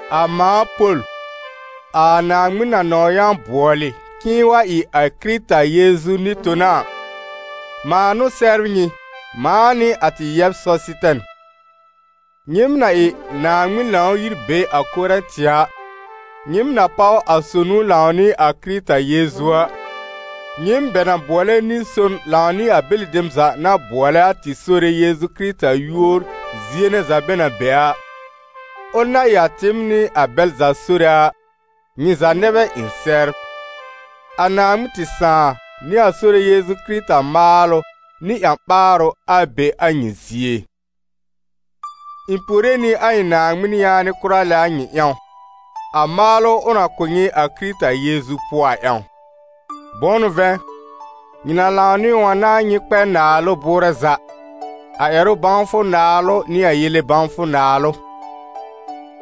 A mãa Pol, a Naaŋmɩn na nɔ̃w yã bʋɔlɩ k'ɩ̃ɩ wa ɩ a Kɩrɩta Yeezu nɩ-tona a, mãa n'ʋ sɛbr nyɩ, mãa nɩ a tɩ yɛb Sɔsɩtɛn. Nyɩɩm na ɩ Naaŋmɩn Lãw-yir be a Korɛ̃tɩ a, nyɩɩm na páw a sonu lãw nɩ a Kɩrɩta Yeezu a, nyɩɩm bɛ na bʋɔlɛ nɩ-son lãw nɩ a bɛlɩ dem za na bʋɔlɛ a tɩ Sore Yeezu Kɩrɩta yúor zie nɛ za bɛ na be a, ʋl na ɩ a tɩɩm nɩ a bɛl za Sore a, nyɩ za nɛ bɛ ɩ̃ sɛbr. A Naaŋmɩn tɩ Sãà nɩ a Sore Yeezu Kɩrɩta maalʋ nɩ ƴã-ɓaarʋ, a be a nyɩ zie. Ɩ̃ puore nɩ a ɩ̃ Naaŋmɩn yaanɩ kʋra lɛ a nyɩ ƴãw, a maalʋ ʋ na kʋ̀ nyɩ a Kɩrɩta Yeezu pʋɔ a ƴãw. Bʋ̃ʋ n'ʋ vɛ̃, nyɩ na lãw nɩ ʋ a n'a nyɩ kpɛ naalʋ bʋʋrɛ za, a ƴɛrʋ bãwfʋ naalʋ nɩ a yele bãwfʋ naalʋ.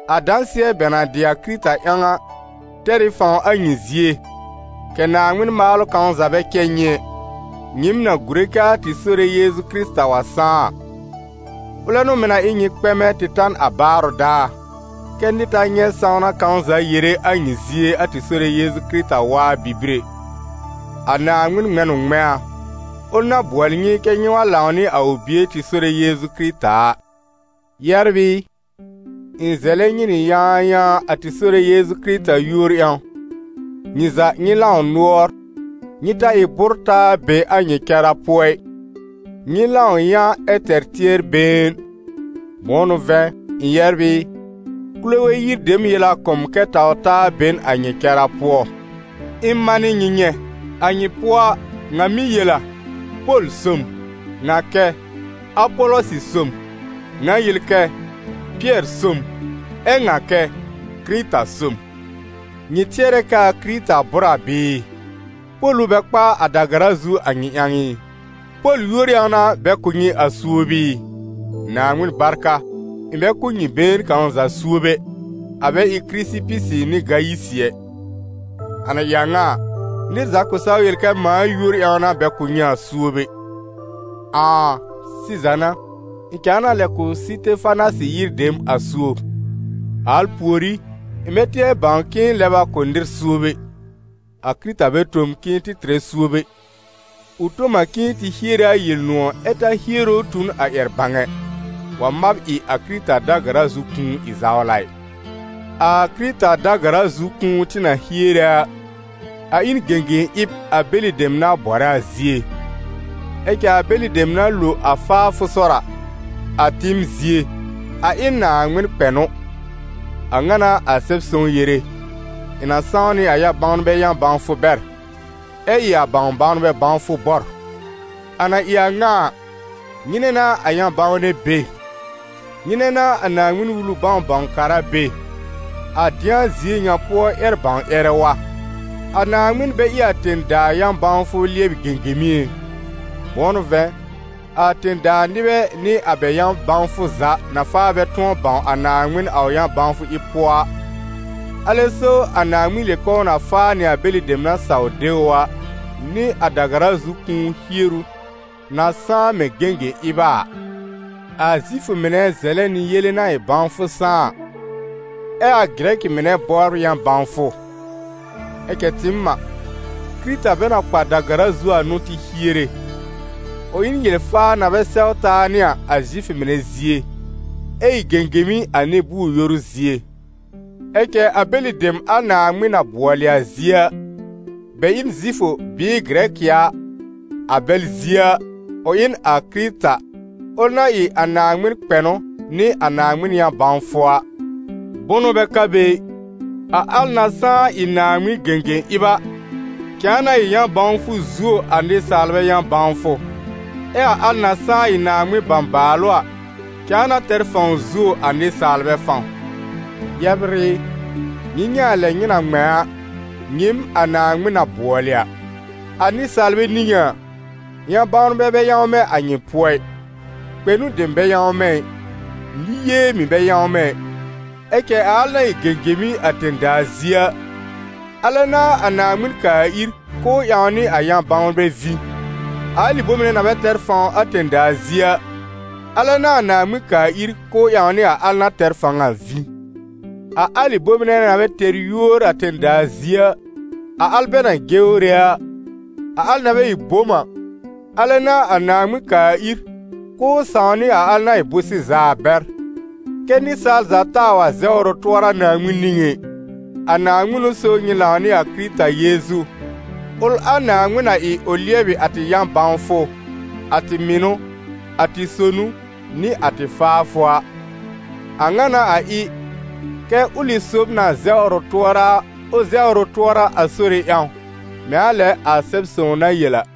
A dãsɩɛ bɛ na dɩ a Kɩrɩta ƴãw a, tɛr ɩ fãw a nyɩ zie, kɛ̀ Naaŋmɩn maalʋ kãw za bɛ cɛ nyɩ ɛ, nyɩɩm na gùre kɛ a tɩ Sore Yeezu Kɩrɩta wa sãá a. Ʋlɛ n'ʋ mɩ̀ na ɩ nyɩ kpɛmɛ tɩ ta n a baarʋ daar, kɛ́ nɩr ta nyɛ̃ sãwna kãw za yere a nyɩ zie a tɩ Sore Yeezu Kɩrɩta waa bibir ɛ. A Naaŋmɩn ŋmɛ̃ n ʋ ŋmɛ̃a, ʋl na bʋɔlɩ nyɩ kɛ́ nyɩ wa lãw nɩ a ʋ Bie tɩ Sore Yeezu Kɩrɩta a. Yɛbr ɩ, ɩ̃ zɛlɛ nyɩ nɩ yãayãa a tɩ Sore Yeezu Kɩrɩta yúor ƴãw, nyɩ za nyɩ lãw nʋɔr, nyɩ ta ɩ bʋ́r-taa be a nyɩ cara pʋɔ ɩ; nyɩ lãw yã ɛ tɛr tɩɛr-been. Bʋ̃ʋ n'ʋ vɛ̃, ɩ̃ yɛbr ɩ, Kulowe yir dem yel a kʋ̀ m kɛ taw-taa be n a nyɩ cara pʋɔ. Ɩ̃ manɩ nyɩ nyɛ̃: a nyɩ pʋɔ a, ŋa mɩ́ yel a: «Pol so m», ŋa kɛ: «Apɔlɔsɩ so m», ŋa yel kɛ: «Pɩɛr so m», ɛ ŋa kɛ: «Kɩrɩta so m». Nyɩ tɩɛrɛ kɛ́ a Kɩrɩta bʋ́r a bɩɩ? Pol ʋ bɛ kpa a da-gara zu a nyɩ ƴãw ɩ? Pol yúor ƴãw n'a bɛ kʋ̀ nyɩ a suob ɩ? Naaŋmɩn barka! Ɩ̃ bɛ kʋ̀ nyɩ been kãw za suob ɛ, a bɛ ɩ Kɩrɩsɩpɩsɩ nɩ Gayisɩ ɛ. A na ɩ a ŋa a, nɩr za kʋ̃ saw yel kɛ mãa yúor ƴãw n'a bɛ kʋ̀ nyɩ a suob ɛ. Ãà! Sɩza n'a, ɩ̃ cãa na lɛ kʋ̀ Sɩtefanasɩ yir dem a suob. A al pùorí, ɩ̃ bɛ tɩɛr bãw k'ɩ̃ɩ lɛb a kʋ̀ nɩr suob ɛ. A Kɩrɩta bɛ tõ m k'ɩ̃ɩ tɩ tɩrɛ suob ɛ, ʋ tõ m a k'ɩ̃ɩ tɩ hiere a Yel-nʋ̃ɔ̀, ɛ ta hiere ʋ tu n a ƴɛr-bãw ɛ, wa mab ɩ a Kɩrɩta da-gara zu kũu ɩ zawla ɩ. A Kɩrɩta da-gara zu kũu tɩ na hiere a, a ɩ n gẽgẽ-ɩb a bɛlɩ dem na bɔrɛ a zie; ɛ cɛ a bɛlɩ dem na lo a faafʋ sɔr a, a tɩɩm zie, a ɩ n Naaŋmɩn kpɛnʋ. A ŋa n'a a Sɛb-sõw yere: «Ɩ̃ na sãw nɩ a yã-bawnbɛ yã-bãwfʋ bɛr, ɛ ɩ a bãw-bãwnbɛ bãwfʋ bɔr.» A na ɩ a ŋa a, nyɩnɛ n'a a yã-bãwnɛ be? Nyɩnɛ n'a a Naaŋmɩn-Wulu bãw-bãw-kara be? A dɩ̃a zie ŋa pʋɔ ƴɛr-bãw-ƴɛrɛ wa? A Naaŋmɩn bɛ ɩ a tẽ-daa yã-bãwfʋ lɩɛbɩ gẽgẽmi ɩ? Bʋ̃ʋ n'ʋ vɛ̃, a tẽ-daa nɩbɛ nɩ a bɛ yã-bãwfʋ za na faa bɛ tʋ̃ɔ bãw a Naaŋmɩn a ʋ yã-bãwfʋ ɩb pʋɔ a, alɛ so a Naaŋmɩn yel k'ʋʋ na faa nɩ a bɛlɩ dem na saw de ʋ a, nɩ a da-gara zu kũu hieru na sãá mɛ̃ gẽgẽ-ɩb a a. A Zifʋ mɩnɛ zɛlɛ nɩ yele na ɩ bãwfʋ sãá a, ɛ a Gɩrɛkɩ mɩnɛ bɔbr yã-bãwfʋ; ɛ cɛ tɩɩm a, Kɩrɩta bɛ na kpa da-gara zu a n'ʋ tɩ hiere: ʋ ɩ n yel-faa na bɛ sɛw taa nɩ a, a Zifʋ mɩnɛ zie, ɛ ɩ gẽgẽmi a nɩ-bʋʋr-yoru zie. Ɛ cɛ a bɛlɩ dem a Naaŋmɩn na bʋɔlɩ a zie a, bɛ ɩ n Zifʋ bɩɩ Gɩrɛkɩ a, a bɛl zie a, ʋ ɩ n a Kɩrɩta, ʋl na ɩ a Naaŋmɩn kpɛnʋ nɩ a Naaŋmɩn yã-bãwfʋ a. Bʋnʋ bɛ ka be ɩ, a al na sãá ɩ Naaŋmɩn gẽgẽ-ɩb a, cãa na ɩ yã-bãwfʋ zuo a nɩsaalbɛ yã-bãwfʋ, ɛ a al na sãá ɩ Naaŋmɩn bãbaalʋ a, cãa na tɛr fãw zuo a nɩsaalbɛ fãw. Yɛbr ɩ, nyɩ nyɛ̃ a lɛ nyɩ na ŋmɛ̃ a, nyɩɩm a Naaŋmɩn na bʋɔlɩ a: a nɩsaalbɛ niŋé a, yã-bãwnbɛ bɛ yãwmɛ a nyɩ pʋɔ ɩ, kpɛnʋ dem bɛ yãwmɛ ɩ, nɩ-yee mɩ̀ bɛ yãwmɛ ɩ. Ɛ cɛ a al na ɩ gẽgemi a tẽ-daa zie a, alɛ n'a a Naaŋmɩn kaa ir k'ʋʋ ƴãw nɩ a ƴã-bãwnbɛ vĩ; a alɩ bome nɛ na bɛ tɛr fãw a tẽ-daa zie a, alɛ n'a a Naaŋmɩn kaa ir k'ʋʋ ƴãw nɩ a al na tɛr fãw a vĩ; a alɩ bome nɛ na bɛ tɛr yúor a tẽ-daa zie a, a al bɛ na jewre a, a al na bɛ ɩ bom a, alɛ n'a a Naaŋmɩn kaa ir k'ʋʋ sãw nɩ a al na ɩ bʋ̃-sɩza a bɛr, kɛ́ nɩsaal za taa wa zɛwr ʋ tʋɔra Naaŋmɩn niŋé ɩ. A Naaŋmɩn n'ʋ so nyɩ lãw nɩ a Kɩrɩta Yeezu, ʋl a Naaŋmɩn na ɩ ʋ lɩɛbɩ a tɩ yã-bãwfʋ, a tɩ mɩnʋ, a tɩ sonu, nɩ a tɩ faafʋ a. A ŋa n'a a ɩ kɛ́: «Ʋlɩ sob na zɛwr ʋ tʋɔra a, ʋ zɛwr ʋ tʋɔra a Sore ƴãw», mɛ̃ a lɛ a Sɛb-sõw na yel a.